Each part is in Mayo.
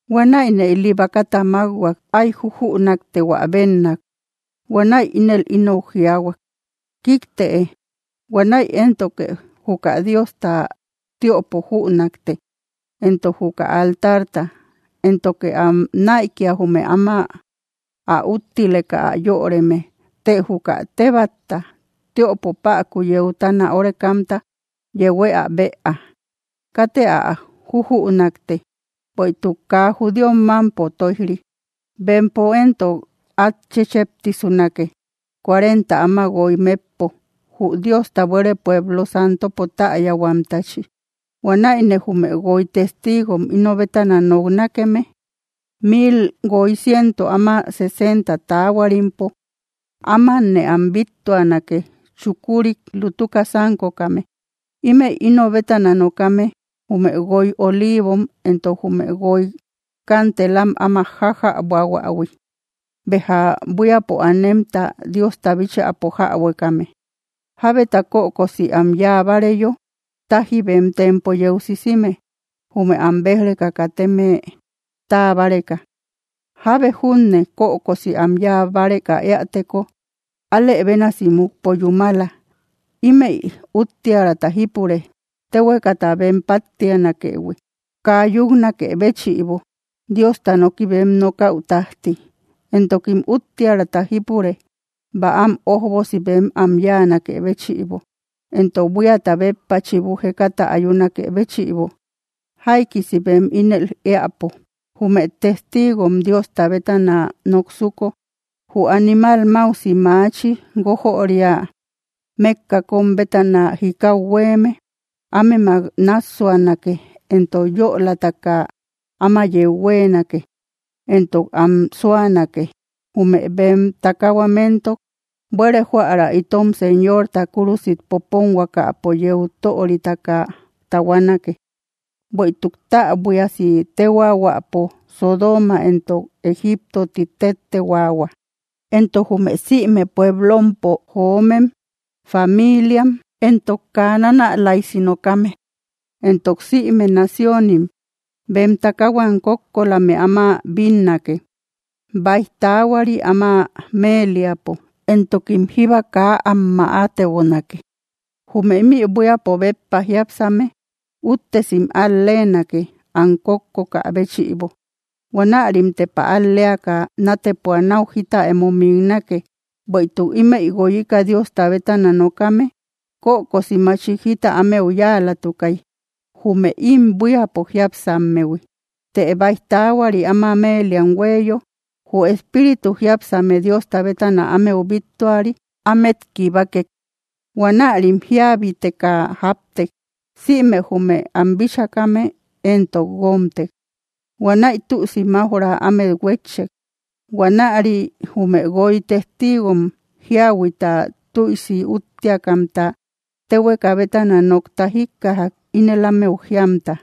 Huanäine ili bakata mákhuak, áy jujünaktehuä bennak. Huanäi ínel ínou jiayhuak: —¡Kiktëe! Huanäi éntoke juka Diosta tiöpo jünakte, entok juka altarta, éntoke am näikia, jume áma ä úttileka ä yöreme. Të juka tebatta tiöpo päku yeutana órekamta, yehuë ä bëa. Katë ä jújünakte, bueïtuk kaa judíom mámpo tóij‑ri. Bempo éntok át chécheptisunake, cuarenta áma guoy metpo, jü Diosta buére pueblo santopo täyahuamtachi. Huanäine jume guoy testiigom íno bétana noknakeme, mil guoy ciento áma sesenta taahuarimpo, ámanne am bíttuanake, chukurik lutuka sánkokame. Ímëi íno bétana nokame, jume guoy oliivom entok jume guoy kanteelam áma jájäbohuähui, béja buíapo anemta Diosta bíchäpo jäbuekame. Jábeta kökosi am yáa báareyo, táji bem tempo yeu sisime, jume am béj‑reka kateme táa báreka. Jábe junne kökosi am yáa báreka éäteko, alë bénasi mukpo yúmala. Ímëi úttiärata jípure, téhuekata bem páttianakëhui, kaa yúknakë béchïbo, Diosta noki bem nokäu tájti. Entokim úttiärata jípure, bäam ójbosi bem am yáanakë béchïbo, entok buíata béppa chibu jekata ayunakë béchïbo, jaikisi bem ínel éäpo. Jume testiigom Diosta bétana noksuko, jü animal máusi maachi guójöria mékka kóm bétana jikau huéeme, ámemak náassuanake, entok yölataka áma yeu huéenake, entok am súanake. Jume bem takahuam éntok, buére jóära itom Señorta kúrusit poponhuakapo yeu töritaka tahuanake, bueïtuk täbuiasi téhuaahuäpo Sodooma entok Egipto ti téttehuaahua. Entok jume sïme pueblompo joomem, famiiliam, entok kaa nanälaisi nokame, entok síme naciónim,, bem takahuam kókkolame áma bínnake, báij taahuari áma meeliapo, entokim jíba kaa am mäatebonake. Jume ímï buíapo béppa jiápsame úttesim al-leenake, am kókkokä béchïbo. Huanärim tepa al‑leaka nátepua náu jita emo miknake. Bueïtuk ímëi guoyika Diosta bétana nokame, kökosi machik jita ámeu yáalatukay, jume ím buíapo jiápsammehui. Të báij taahuari áma meeliam huéeyo, jü espíritu jiápsame Diosta bétana ámeu bíttuari ámet kibakek. Huanärim jíabetaka jáptek. Sïme jume am bíchakame éntok guómtek; huanäi tüisi maujra amet huetchek. Huanäri jume guoy testiigom jíahuita tüisi úttiakamta téhueka bétana nokta jíkkajak, ínel ámeu jíamta: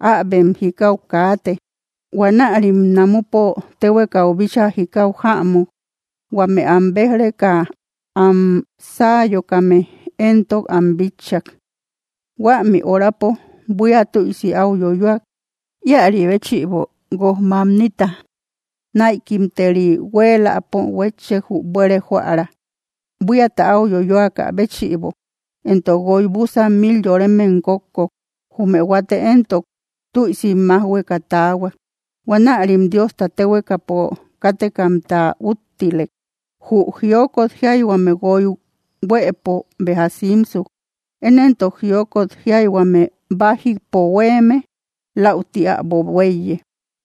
—¡Äbem jikau kaate! Huanärim namupo téhuekau bíchaa jikau jämuk. Huame am béj‑reka am sáayokame éntok am bitchak. Huämi horapo buía tüisi áu yoyoak. Íäri béchïbo, guoj mamnita näikimteri huéeläpo huétchek jü buére jóära, buíata áu yoyoakä béchïbo, entok guoy búsan mil yoremem kókkok. Jume huate éntok, tüisim májhueka taahuak. Huanärim Diosta téhuekapo kátekamta úttilek. Jü jiokot jiayhuame guoy huëpo béja simsuk. Én éntok, jiokot jiayhuame bájipo huéeme läuti äbo huéiye.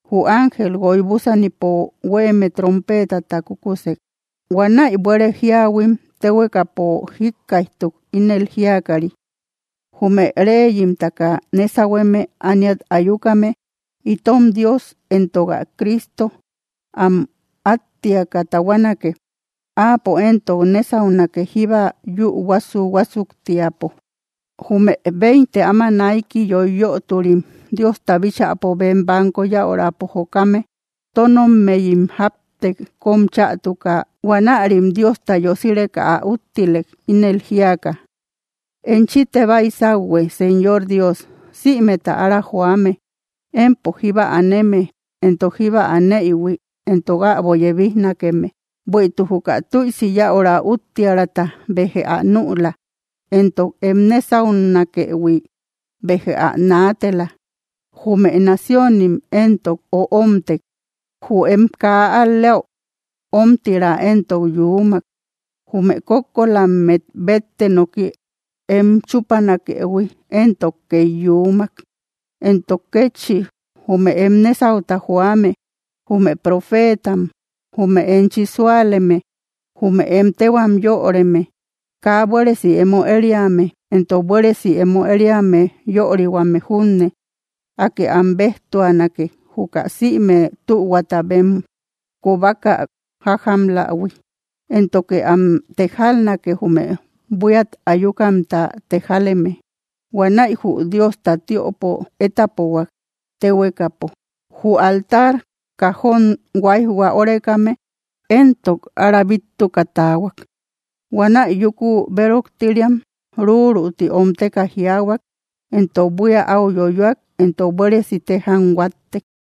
Jü ángel guoy búsanipo huéeme trompeetata kúkusek. Huanäi buére jíahuim téhuekapo jíkkaijtuk, ínel jíakari: Jume reyimtaka nésahueme ániat ayukame, itom Dios entok ä Cristo am áttiaka tahuanake. Áapo éntok nésaunake jíba yü huásu‑huásuktiapo. Jume veinte áma naiki yoiyöturim, Diosta bíchäpo bem banko yäurapo jokame, tónommeyim jáptek kóm chätuka, huanärim Diosta yosireka ä úttilek, ínel jíaka: Enchite baisauhue, Señor Dios, sïmeta ára joame, empo jíba aneme, entok jíba aneïhui, entok äbo yebijnakeme. Bueïtuk juka tüisi yäura úttiärata, béjë ä nüla. Entok em nésaunakëhui, béjë ä naatela. Jume naciónim, éntok öomtek; jü em kaa al‑lea ómtira éntok yuumak. Jume kókkolammet bette noki em chúpanakëhui éntok két yuumak. Entok kétchi, jume em nésauta joame, jume profeetam, jume enchi súaleme, jume em téhuam yöreme, kaa buéresi emo ériame entok buéresi emo ériame yörihuame junne, Akë am béjtuanake, juka sïme tühuata bem kobaka jájamlähui. Éntoke am tejalnake, jume buíat ayukamta tejaleme. Huanäi jü Diosta tiöpo étapohuak téhuekapo. Jü altar kajón huáijhua órekame éntok ára bíttuka taahuak. Huanäi yúku béroktiriam ruruti omteka jiaahuak, éntok buía áu yoyoak, éntok buéresi téjam huáttek.